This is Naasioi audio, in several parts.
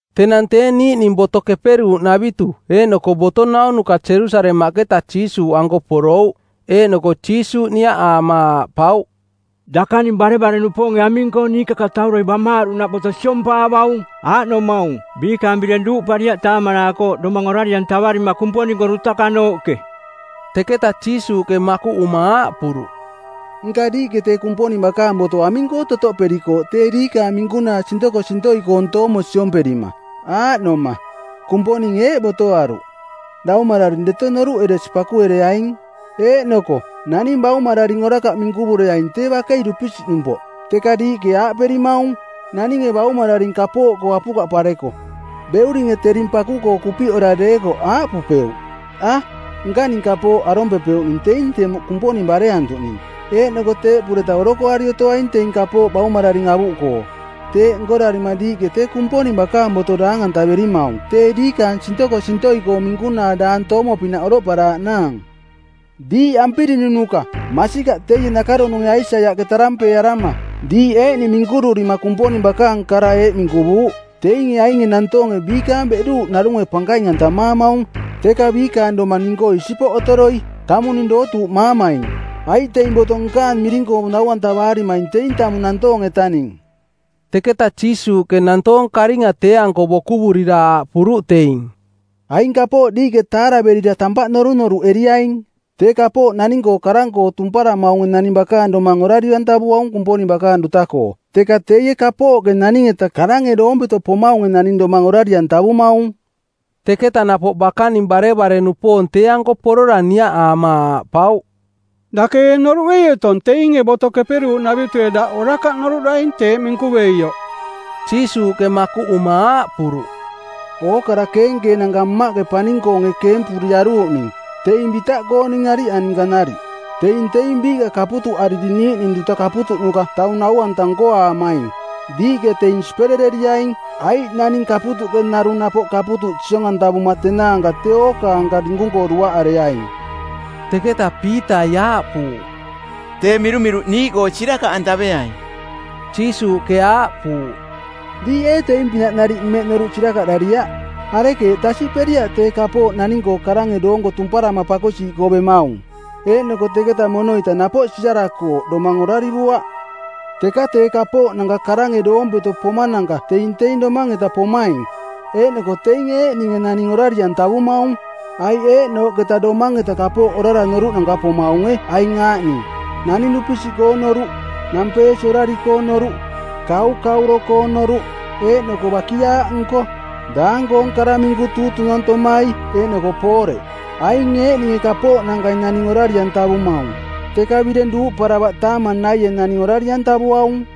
Tenang tee niiꞌning Boto Keperuuꞌnavitu eeꞌnoko boto naunuka Jerusalemaꞌketa Jiisuuꞌanko porouꞌ. Eeꞌnoko Jiisuuꞌ niaꞌaama aaꞌpauꞌ, “Dakaning barevare-nupoonge aming-koo niikakatauroi bamaaruꞌnaꞌ boto siompaavaung, aaꞌnomaung, biikaang bireng duuꞌpariaꞌ taamanaakooꞌ domang orari-antavarima Kumponing-koo dutakanooꞌke?” Teketa Jiisuuꞌke makuꞌuma aaꞌpuruꞌ, “Nka diiꞌke tee Kumponing bakaang boto aming-koo totoꞌperikooꞌ tee diikaang minkunaa sintokosintoi-koong toomo siomperima? Aaꞌnoma, Kumponinge eeꞌ botoaruꞌ, ‘Daumararing deto noruꞌeresi pakuereaing,’ eeꞌnoko, ‘Naning baumararing orakaꞌ minkuvureaing tee bakei dupisiꞌnumpoꞌ.’ Teka diiꞌke aaꞌperimaung, ‘Naninge baumararing kapooꞌkoo apukaꞌpareko, beuringe tering paku-koo kupiꞌora deekoꞌ aaꞌpupeuꞌ, “A, nkaning kapooꞌ arompepeuꞌning teing temuꞌ Kumponing bareantuꞌning.” Eeꞌnoko teeꞌpureta orokoari otoaing teing kapooꞌ baumararing avuꞌkoo.’ Teeꞌ nkorarima diiꞌke tee Kumponing bakaang boto daang-antaverimaung tee diikaang sintokosintoi-koong minkunaa daang toomo pinaꞌ oroꞌparaaꞌnaang. Diiꞌ ampirinunuka! Masikaꞌ teie nakaronunge Aisaiaꞌke tarampeearama˜ diiꞌ eeꞌning minkururima Kumponing bakaang kara eeꞌ minkuvuuꞌ, ‘Teinge ainge nantoonge biikaang beꞌduuꞌke narunge pankaing-antamaamaung, teka biikaang domang ning-koo isipoꞌ otoroi. Tamung ning dootuuꞌmaamaing, aiꞌ teing boto nkaang miring-koo nau-antavaarimaing teing tamung nantoong-etaning.’” Teketa Jiisuuꞌke nantoong karinga tee-anko bokuvurira aaꞌpuruꞌ teing, “Aing kapooꞌ diiꞌke taaraverira tampaꞌ norunoruꞌeriaing. Tee kapooꞌ naning-koo karang-koo tumparamaunge naning bakaang domang orari-antavuaung Kumponing bakaang duta-koo, teka teie kapooꞌke naning-eta karange doompeto pomaunge naning domang orari-antavumaung.” Teketa napoꞌ bakaning barevare-nupoong tee-anko porora niaꞌaama aaꞌpauꞌ, “Dake ee noruꞌei otong teinge Boto Keperuuꞌnavitue daꞌ orakaꞌ noruꞌdaing teeꞌ minkuveioꞌ?” Jiisuuꞌke makuꞌuma aaꞌpuruꞌ, “Ookara keenkeenanka Mmaꞌke paning-koonge keempuriaruuꞌning teing bitaꞌkooning ariꞌa ninka nariꞌ. Teing teing biiꞌka kaputuꞌariri niiꞌning duta kaputuꞌnuka taung nau-anta nkoaamaing. Diiꞌke teing siperereriaing, aiꞌ naning kaputuꞌke narung napoꞌ kaputuꞌ siong-antavuma tenaanka tee ookaanka dinkung-koo duaꞌareaing.” Teketa Piitai aaꞌpuuꞌ, “Tee mirumiruꞌ niiꞌkoo sirakaꞌantaveai.” Jiisuuꞌke aaꞌpuuꞌ, “Diiꞌ ee teing-pinaꞌ nariꞌ mmeꞌ noruꞌ sirakaꞌdariaꞌ? Arekeeꞌ tasiꞌperiaꞌ tee kapooꞌ naning-koo karange doonko tumparama pakosiiꞌkoo bemaung, eeꞌnoko teketa mono-ita napoꞌ siarakooꞌ domang orarivuaꞌ? Teka tee kapooꞌnanka karange doompeto pomananka teing teing domang-eta pomaing, eeꞌnoko teinge eeꞌninge naning orari-antavumaung. Aiꞌ eeꞌnooꞌketa domang-eta kapooꞌ orara noruꞌnanka pomaunge aing aaꞌning: naning dupisiꞌkoong noruꞌ, nampeesi orari-koong noruꞌ, kaukauro-koong noruꞌ, eeꞌnoko bakiaaꞌnko, daang-koong kara minku tuutunantomai eeꞌnoko pooreꞌ. Aing eeꞌninge kapooꞌnankai naning orari-antavumaung, teka bireng duuꞌparavaꞌ taamang naie naning orari-antavuaung.”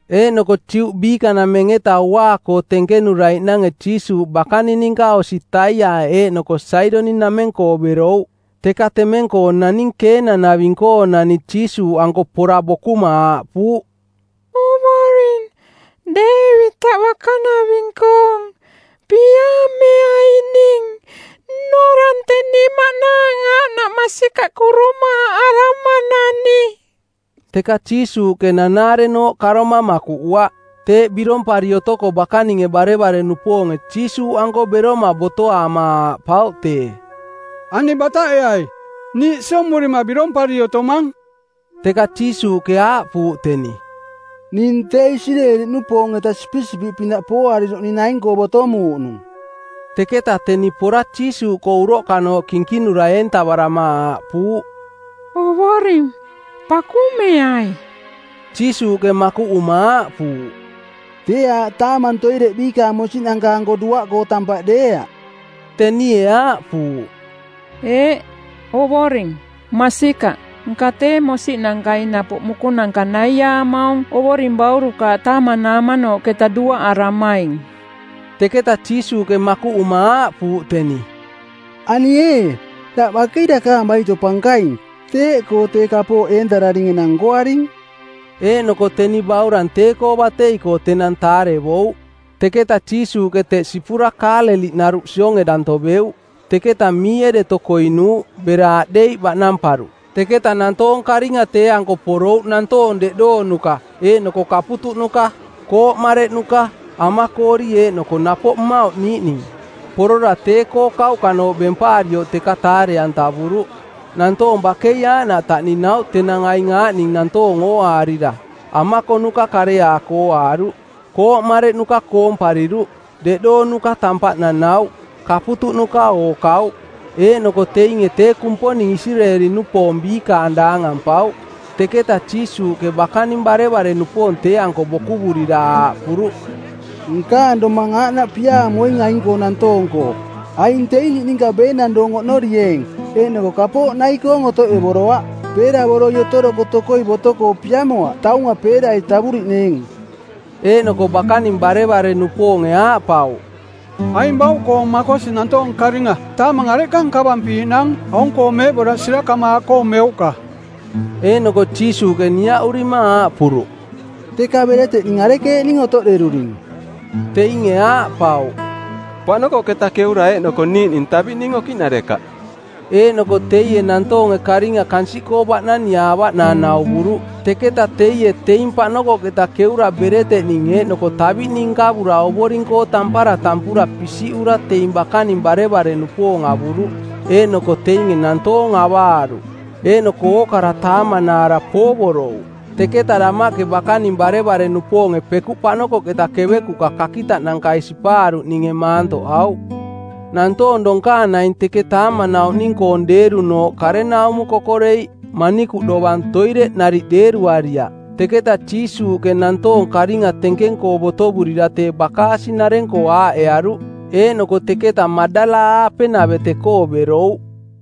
Eeꞌnoko Juꞌ biikanameng-eta uaa-koo tenkenuraiꞌnange Jiisuuꞌ bakaning ninka osi Taiaꞌ eeꞌnoko Saidoniꞌnameng-koo berouꞌ. Teka temeng-koo naning Keenang-naving-koonani Jiisuuꞌanko pora bokuma aaꞌpuuꞌ, “Ovoring, Deevitaꞌ bakanaving-koong, piaameai ning! Nnorang teni maꞌnaang aaꞌnaꞌ masikaꞌ kurumaaꞌaramanani!” Teka Jiisuuꞌke nanaarenooꞌ karoma makuꞌuaꞌ. Teeꞌ birompari otoko bakaninge barevare-nupoonge Jiisuuꞌanko beroma botoaama aaꞌpauꞌ tee, “Ani bataꞌeai. Niiꞌ siomurima birompari otomang.” Teka Jiisuuꞌke aaꞌpuuꞌ teni, “Ning tee Isireeli-nupoong-eta sipisipiꞌpinaꞌ pooariruꞌning naing-koo botomuuꞌnung.” Teketa teni pora Jiisuuꞌkoo uroꞌkanooꞌ kinkinura eentavarama aaꞌpuuꞌ, “Ovoring pakumeai.” Jiisuuꞌke makuꞌuma aaꞌpuuꞌ, “Tee aaꞌ taamang toireꞌ biikaang mosiꞌnanka-anko duaꞌkoo tampaꞌ deeaꞌ.” Tenie aaꞌpuuꞌ, “Eeꞌ, Ovoring, masikaꞌ, nka tee mosiꞌnankai napoꞌ mukunanka naiaamaung ovoring baurukaaꞌ taamanaamanooꞌketa duaꞌarimaing.” Teketa Jiisuuꞌke makuꞌuma aaꞌpuuꞌ teni, “Ani ee, daꞌ bakei dakaang baito pankaing, teeꞌkoo tee kapooꞌ eentararing enang nkoaring.” Eeꞌnoko teni baurang tee-koo batei-koo tenang taarevouꞌ. Teketa Jiisuuꞌke teꞌ sipura Kaaleliꞌnaruꞌ sionge danto beuꞌ. Teketa miie deto koinuuꞌ, bera aꞌdeiꞌ baꞌnamparuꞌ. Teketa nantoong karinga tee-anko porouꞌ nantoong deꞌdoonuka eeꞌnoko kaputuꞌnuka, kooꞌ mareꞌnuka, amakoori eeꞌnoko napoꞌ mmauꞌ niiꞌning. Porora tee-koo kauꞌkanooꞌ bempaarioꞌ teka taare-atavuruꞌ. Nantoong bakei aaꞌnaꞌ taꞌninauꞌ tenang aing aaꞌning nantoong ooaarira, amakonuka kareaako ooaaruꞌ, kooꞌ mareꞌnuka koompariruꞌ, deꞌdoonuka tampaꞌ nanauꞌ, kaputuꞌnuka ookauꞌ. Eeꞌnoko teinge tee Kumponing Isireeli-nupoong biikaang daangampauꞌ. Teketa Jiisuuꞌke bakaning barevare-nupoong tee-anko bokuvurira aaꞌpuruꞌ, “Nkaang domang aaꞌnaꞌ piaamoing aing-koo nantoong-koo. Aing teing niꞌninka beenang doong oꞌnorining eeꞌnoko kapooꞌ nai-koong otoꞌevoroaꞌ. Peeravoroi otoroko tokoi boto-koo piamoaꞌ taunga peerai tavuriꞌneeng.” Eeꞌnoko bakaning barevare-nupoonge aaꞌpauꞌ, “Aing bauꞌkoong makosi nantoong karinga taamang areꞌka nkavampiiꞌnaang aung-koo meeꞌboraꞌ sirakamaaꞌkoo meuꞌka?” Eeꞌnoko Jiisuuꞌke niaꞌurima aaꞌpuruꞌ, “Teka bereteꞌning arekeeꞌning otoꞌderuring?” Teinge aaꞌpauꞌ, “Paꞌnokoꞌketa keura eeꞌnoko niiꞌning taviꞌning okiꞌnarekaꞌ.” Eeꞌnoko teie nantoonge karinga kansiꞌkoo baꞌnaniꞌaavaꞌnaang nauvuruꞌ. Teketa teie teing paꞌnokoꞌketa keura bereteꞌning eeꞌnoko taviꞌning nkavura Ovoring-koo tampara tampura pisiꞌura teing bakaning barevare-nupoong avuruꞌ, eeꞌnoko teinge nantoong avaaruꞌ. Eeꞌnoko ookara taamanaara poovorouꞌ. Teketa damaꞌke bakaning barevare-nupoonge pekuꞌ paꞌnokoꞌketa kevekuꞌka kakitaꞌnankai sipaaruꞌninge maantoꞌauꞌ. Nantoong donkaang naing teke taamanauꞌning-koong deerunooꞌ karenaumo kokoreiꞌ, manikuꞌ dovang toireꞌ nariꞌ deeruariaꞌ. Teketa Jiisuuꞌke nantoong karinga tenkeng-koo botovurira tee bakaasi-nareng-koo aaꞌearuꞌ, eeꞌnoko teketa Maꞌdala-aape-navete-koo berouꞌ.